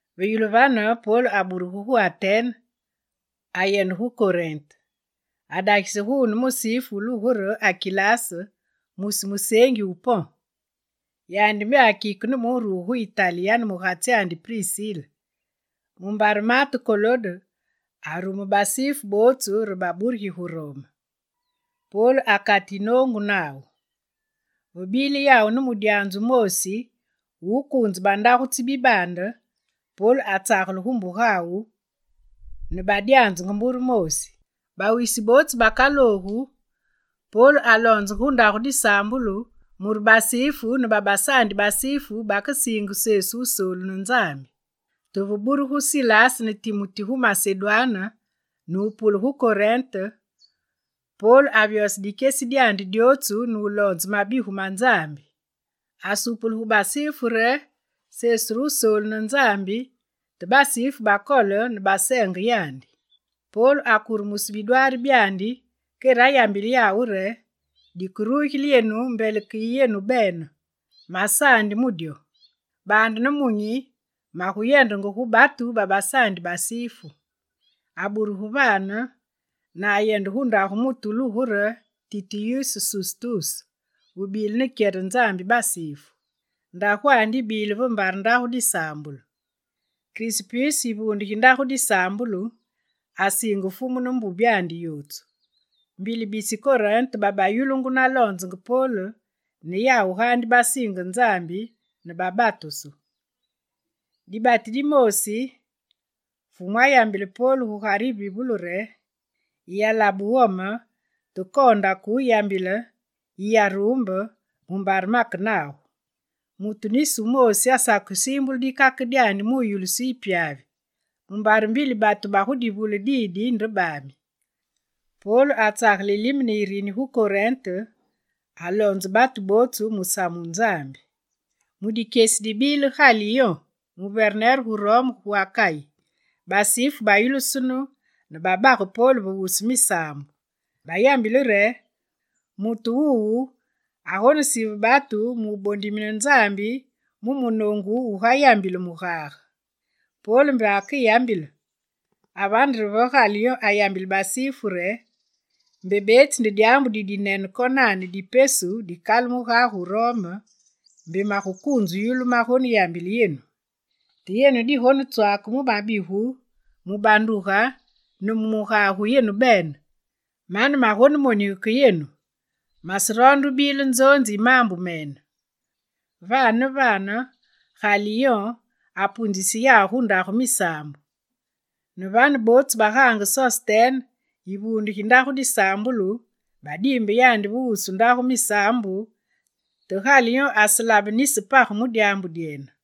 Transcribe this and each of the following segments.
Ve yulu vane, Pol aburugu gu Atene, ayende gu Korinte. Adagise guune musifu wulugu re Akilas mwisi museengi wu Pon. Yandi mbe akike ne mu wuruge gu Itali yane mugatsyandi Prisile, mumbare maate Kolode arume basifu bootsu re baburigi gu Rome. Pol akate yinoongu nawu; ve bile yawu ne mudyanzu wumoosi wu wukuunze bandagu tsi bibaande, Pol atsagele gu mbugawu, ne badyanzenge mbure moosi. Bawisi bootsu bakaloogu, Pol aloonzenge gu ndagu disaambulu mure basifu ne babasaandi basifu bakesiinge Sesu Wusoolu ne Nzambi. Te ve burugu Silas ne Timuti gu Masedwane ne wupule gu Korinte, Pol avyose dikyesi dyandi dyootsu ne wuloonze mabigu ma Nzambi. Asupule gu basifu re Sesu re Wusoolu ne Nzambi, te basifu bakole ne baseenge yandi. Pol akurumuse bidwaari byandi kere ayambile yawu re: «Dikerugile yenu, mbele yigubile ke ne yenu bene, masaandi! Mu dyo. Baande nemunyi, maguyendenge gu batu babasaandi basifu.» Aburugu vane ne ayende gu ndagu mutu wulugungu re Titiyus Sustus, wubile ne kyere Nzambi basifu. Ndagwandi yibile ve mbare ndagu disaambulu. Krispuse, yivuunde gi ndagu disaambulu, asiinge Fumu ne mbubyandi yootsu. Mbili bisi Korinte, babayulungu naloonzenge Pol, ne yawu gaandi basiinge Nzambi ne babatusu. Dibati dimoosi, Fumu ayambile Pol gugare yivivulu re: «Yiyalabe wome, te koonda ke wuyambile, yiyaruumbe, mumbare make nagu. Mutu nisi wumoosi asakesiimbule dikake mu yu mu wuyulusu yu pyavi, mumbare mbili batu ba gu divule didi nde baami.» Pol atsagele yilime ne yirini gu Korinte, aloonzenge batu bootsu musamu wu Nzambi. Mu dikyesi dibile Galiyon muverner wu Rome gu Akayi, basifu bayulusunu ne babage Pol ve wusu misaambu. Bayambile re: «Mutu wuwu agonesive batu mu wubondimine Nzambi mu munoongu wugayambile mugage!» Pol mbe akeyambile, avane re ve Galiyon ayagule basifu re: «Mbe beetsi nde dyaambu didinene konane di pesu dikale mugage wu Rome, mbe magukuunze wuyulu magoneyambile yenu. Te yenu digonetswake mu mabigu, mu banduge ne mu mugage wu yenu bene, mane magonemonige ke yenu; maseroonde wubile nzoonzi yi maambu mene.» Vane ne vane Galiyon apuunzise yawu gu ndagu misaambu. Ne vane, bootsu bagaange Sostene, yivuunde gi ndagu disaambulu, badiimbe yandi ve wusu ndagu misaambu, te Galiyon aselabe nisi page mu dyaambu dyene.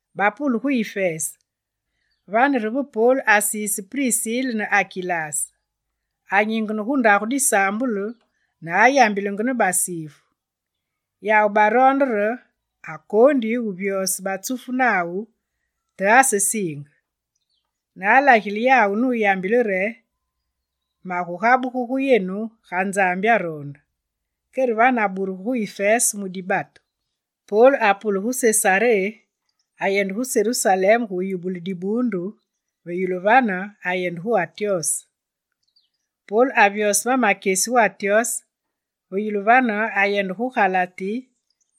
Bapule gu Ifese, vane re ve Pol asiise Prisile ne Akilas. Anyingene gu ndagu disaambulu ne ayambilenge ne basifu. Yawu baroonde re akoondi wuvyose ma batsufu nawu, te asesiinge. Ne alagile yawu nuyambile re: «Magugabugu gu yenu, ga Nzambi aroonde.» Kere vane aburugu gu Ifese mu dibatu. Pol apule gu Sesaré, ayende gu Serusalem gu yubule dibuundu, ve yulu vane ayende gu Antyose. Pol avyose ma makyesi gu Antyose, ve yulu vane, ayende gu Galati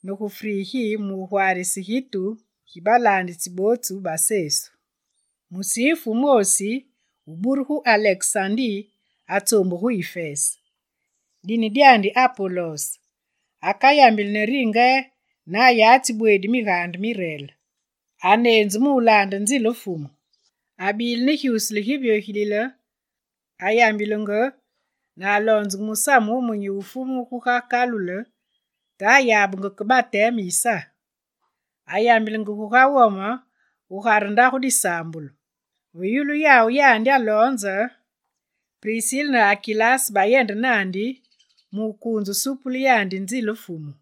ne gu Frigi mu wugwaarise gitu gi balaanditsi bootsu ba Sesu. Musifu wumoosi, wuburu gu Alekesandi, atsoombuge gu Ifese. Dine dyandi Apolos. Akayambili ne ringe ne ayatsi bweedi Migaande mi Reel. Aneenzu mu wulaande nzile Fumu. Abile ne gyusule givyogilile, ayambilenge ne aloonzenge musamu wumunyi wu Sesu guga kalule, te ayabenge ke bateme yi Sa. Ayambilenge guga wome gugare ndagu disaambulu. Ve yulu yawu yandi aloonze, Prisile ne Akilas bayende naandi mu wukuunze wusupule yandi nzile Fumu.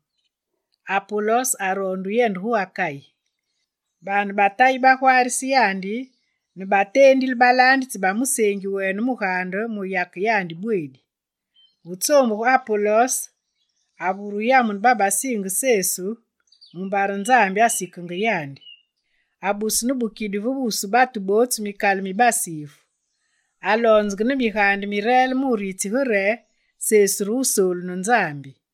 Apolos aroonde wuyende gu Akayi. Baane ba Tayi bagwaarise yandi ne bateendile balaanditsi ba museengi wene mugaande mu wuyake yandi bweedi. Ve tsoombuge Apolos, avure wuyamune babasiinge Sesu mumbare Nzambi asikenge yandi. Abuse ne bukidi ve wusu batu bootsu mikalu mi basifu. Aloonzenge ne Migaande mi Reel mu wuritsige re Sesu re Wusoolu ne Nzambi.